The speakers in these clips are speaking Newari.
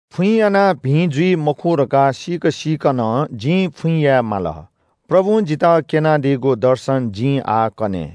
फुइँ यानाः भिं जुइ मखु धकाः सीक सीकं नं जिं फुइँ याये माल। प्रभुं जितः क्‍यनादीगु दर्शन जिं आः कने।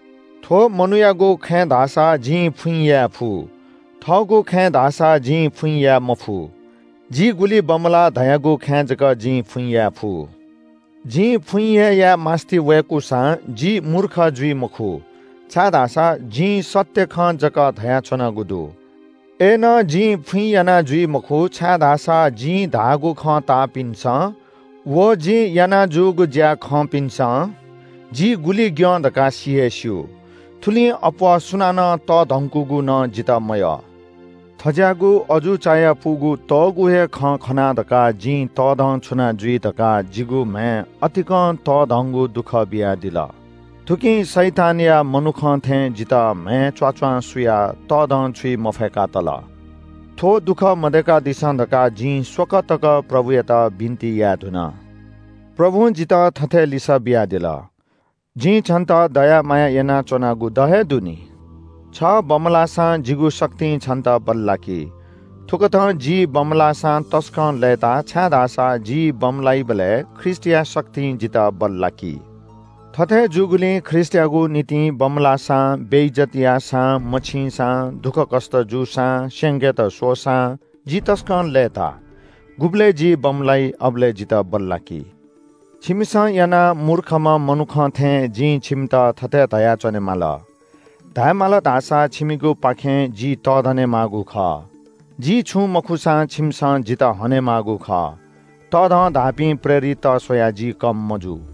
थ्‍व मनूयागु खँय् धाःसा जिं फुइँ याये फु, थःगु खँय् धाःसा जिं फुइँ याये मफु। जि गुलि बमलाः धयागु खँय् जक जिं फुइँ याये फु। जिं फुइँ हे याये मास्‍ति वय्‌कूसां जि मूर्ख जुइ मखु, छाय्‌धाःसा जिं सत्‍य खँ जक धयाच्‍वनागु दु। अय्‌नं जिं फुइँ याना जुइ मखु, छाय्‌धाःसा जिं धाःगु खँ ताःपिन्‍सं व जिं याना जूगु ज्‍या खंपिन्‍सं जि गुलि ग्‍यं धकाः सि हे स्‍यू, थुलिं अप्‍वः सुनानं तःधंकूगु नं जितः मयः। थज्‍याःगु अजू चायापुगु तःगू हे खँ खना धकाः जिं तःधंछुना जुइ धकाः जिगु म्‍हय् अतिकं तःधंगु दुःख बियादिल। थुकिं शैतानया मनुखं थें जितः म्‍हय् च्‍वाच्‍वां सुयाः तःधंछुइ मफय्‌का तल। थ्‍व दुःख मदय्‌कादिसँ धकाः जिं स्‍वकः तक प्रभुयात बिन्‍ति याये धुन। प्रभुं जितः थथे लिसः बियादिल – “जिं छन्‍त दया माया यानाच्‍वनागु द हे दु नि। छ बमलाःसां जिगु शक्तिं छन्‍त बल्‍लाकी।” थुकथं जि बमलाःसां तसकं लय्‌ताः, छाय्‌धाःसा जि बमलाइबलय् ख्रीष्‍टया शक्तिं जितः बल्‍लाकी। थथे जूगुलिं ख्रीष्‍टयागु निंतिं बमलाःसां, बेइज्‍जत याःसां, मछिंसां, दुःखकष्‍ट जूसां, स्‍यंकेत स्‍वःसां, जि तसकं लय्‌ताः। गुबलय् जि बमलाइ अबलय् जितः बल्‍लाकी। छिमिसं यानाः मूर्खम्‍ह मनुखं थें जिं छिमित थथे धया च्‍वनेमाली। धायेमाल धाःसा छिमिगुपाखें जि तःधने माःगु खः। जि छुं मखुसां छिमिसं जितः हनेमाःगु खः। तःधं धाःपिं प्रेरितत स्‍वयाः जि कम मजू।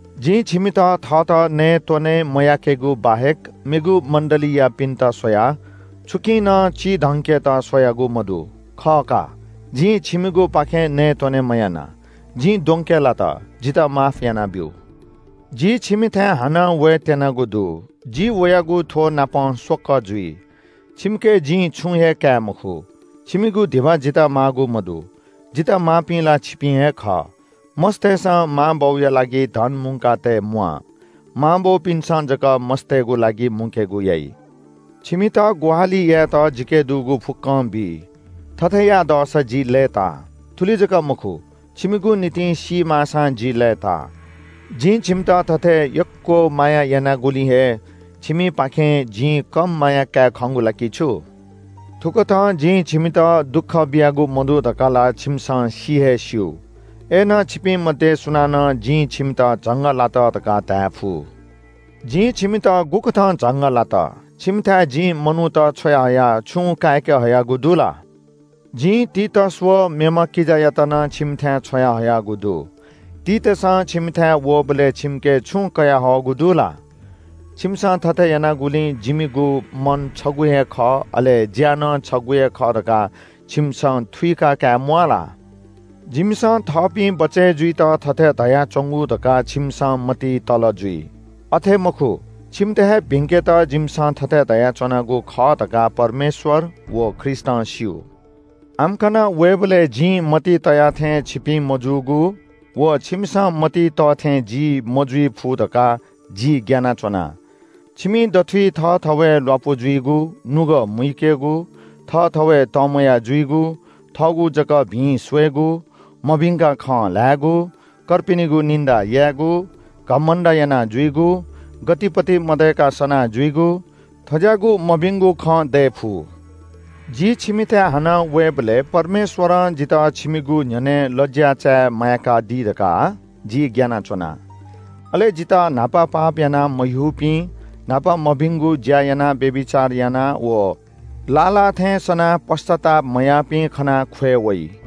जिं छिमित थःत नयेत्‍वने मयाकेगु बाहेक मेगु मण्‍डलीयापिन्‍त स्‍वयाः छुकिं नं चिधंकेत स्‍वयागु मदु। खः का, जिं छिमिगुपाखें नयेत्‍वने मयाना। जिं द्वंके लात, जितः माफ यानाब्‍यु। जि छिमिथाय् हानं वयेत्‍यनागु दु। जि वयागु थ्‍वनापं स्‍वकः जुइ। छिमिके जिं छुं हे काये मखु। छिमिगु धिबा जितः माःगु मदु, जितः माःपिं ला छिपिं हे खः। मस्‍तय्‌सं मांबौया लागि धन मुंकातये म्‍वाः, मां बौपिन्‍सं जक मस्‍तय्‌गु लागि मुंकेगु याइ। छिमित ग्‍वाहालि यायेत जिके दुगु फुक्‍कं बी। थथे याये दःसा जि लय्‌ताः। थुलि जक मखु, छिमिगु निंतिं सी माःसां जि लय्‌ताः। जिं छिमित थथे यक्‍व माया यानागुलिं हे छिमिपाखें जिं कम माया काये खंगु ला कि छु? थुकथं जिं छिमित दुःख बियागु मदु धकाः ला छिमिसं सि हे स्‍यू। अय्‌नं छिपिं मध्‍ये सुनानं जिं छिमित झंगः लात धकाः धायेफु। जिं छिमित गुकथं झंगः लात? छिमिथाय् जिं मनूत छ्वयाहयाः छुं काय्‌के हयागु दु ला? जिं तीतस व मेम्‍ह किजायात नं छिमिथाय् छ्वयाहयागु दु। तीतसं छिमिथाय् वःबलय् छिमिके छुं कयाहःगु दु ला? जिमिसं थथे यानागुलिं जिमिगु मन छगू हे खः अले ज्‍या नं छगू हे खः धकाः छिमिसं थुइका काये म्‍वाः ला? जिमिसं थःपिं बचय् जुइत थथे धयाच्‍वंगु धकाः छिमिसं मतिइ तल जुइ। यःपिं, अथे मखु, छिमित हे भिंकेत जिमिसं थथे धयाच्‍वनागु खः धकाः परमेश्‍वर व ख्रीष्‍टं स्‍यू। आम्‍कन वयेबलय् जिं मतिइ तया थें छिपिं मजूगु, व छिमिसं मतिइ तः थें जि मजुइ फु धकाः जि ग्‍यानाच्‍वना। छिमि दथुइ थःथवय् ल्‍वापु जुइगु, नुगः मुइकेगु, थःथवय् तंम्‍वया जुइगु, थःगु जक भिं स्‍वयेगु, मभिंकाः खँ ल्‍हायेगु, कर्पिनिगु निन्‍दा यायेगु, घमण्‍ड यानाजुइगु, गतिपति मदय्‌क सना जुइगु, थज्‍याःगु मभिंगु खँ दये फु। जि छिमिथाय् हानं वय्‌बलय् परमेश्‍वरं जितः छिमिगु न्‍ह्यःने लज्‍या चाये माय्‌कादी धकाः जि ग्‍यानाच्‍वना। अले जितः न्‍हापा पाप यानाः मह्यूपिं, न्‍हापा मभिंगु ज्‍या यानाः व्‍यभिचार यानाः व लाः लाः थें सनाः पश्‍चाताप मयाःपिं खनाः ख्‍वये वइ।